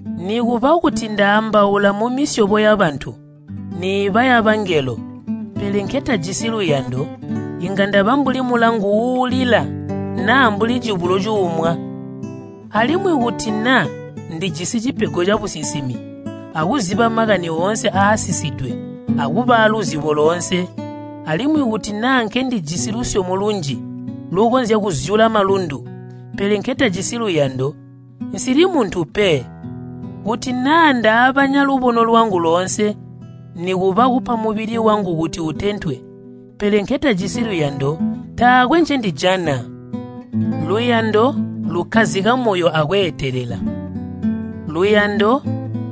Nikuba kuti ndaambaula mumisyobo yabantu, niiba yabangelo, pele nketajisi luyando, inga ndaba mbuli mulangu uulila naa mbuli cibulo cuumwa. Alimwi kuti naa ndijisi cipego cabusinsimi, akuziba makani oonse aasisidwe akuba aaluzibo loonse, alimwi kuti naa nkendijisi lusyomo lunji lukonzya kuzyula malundu, pele nketajisi luyando, nsili muntu pe. Kuti naa ndaabanya lubono lwangu loonse, nikuba kupa mubili wangu kuti utentwe, pele nketajisi luyando, taakwe ncendijana. Luyando lukkazika moyo akweetelela. Luyando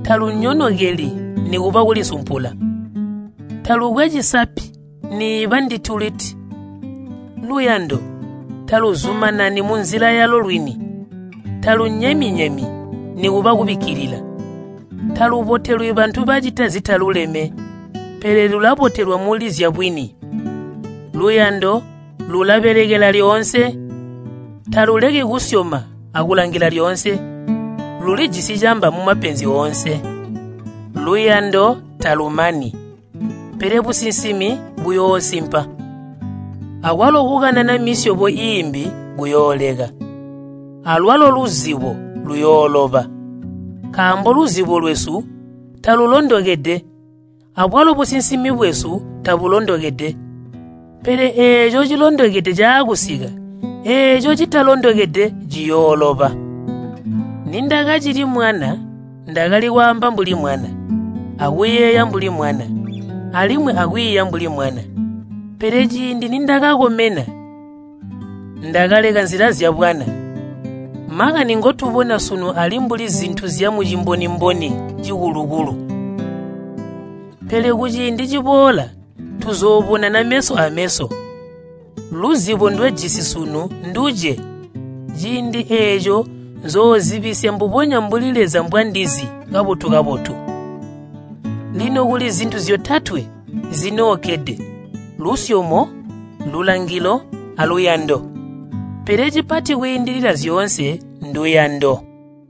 talunyonokeli nikuba kulisumpula. Talukwe cisapi niiba nduti-luti. Luyando taluzumanani munzila yalo lwini, talunyemi-nyemi nikuba kubikkilila. Talubotelwi bantu bacita zitaluleme, pele lulabotelwa muli zyabwini. Luyando lulabekelela lyoonse, taluleki kusyoma akulangila lyoonse, lulijisi camba mumapenzi oonse. Luyando talumani, pele businsimi buyoosimpa, akwalo kukanana misyobo iimbi kuyooleka, alwalo luzibo luyooloba. Nkaambo luzibo lwesu talulondokede, abwalo businsimi bwesu tabulondokede. Pele eeco cilondokede caakusika, eeco citalondokede ciyooloba. Nindakacili mwana, ndakali kwaamba mbuli mwana, akuyeeya mbuli mwana, alimwi akwiiya mbuli mwana. Pele ciindi nindakakomena, ndakaleka nzila zyabwana. Makani ngotubona sunu ali mbuli zintu zyamuciboni-boni cikulu-kulu. Pele kuciindi ciboola tuzoobonana meso ameso. Luzibo ndwejisi sunu nduce, ciindi eeco nzoozibisya mbubonya mbuli Leza mbwandizi kabotu-kabotu. Lino kuli zintu zyotatwe zinookkede, lusyomo, lulangilo, aluyando. Pele cipati kwiindilila zyoonse nduyando.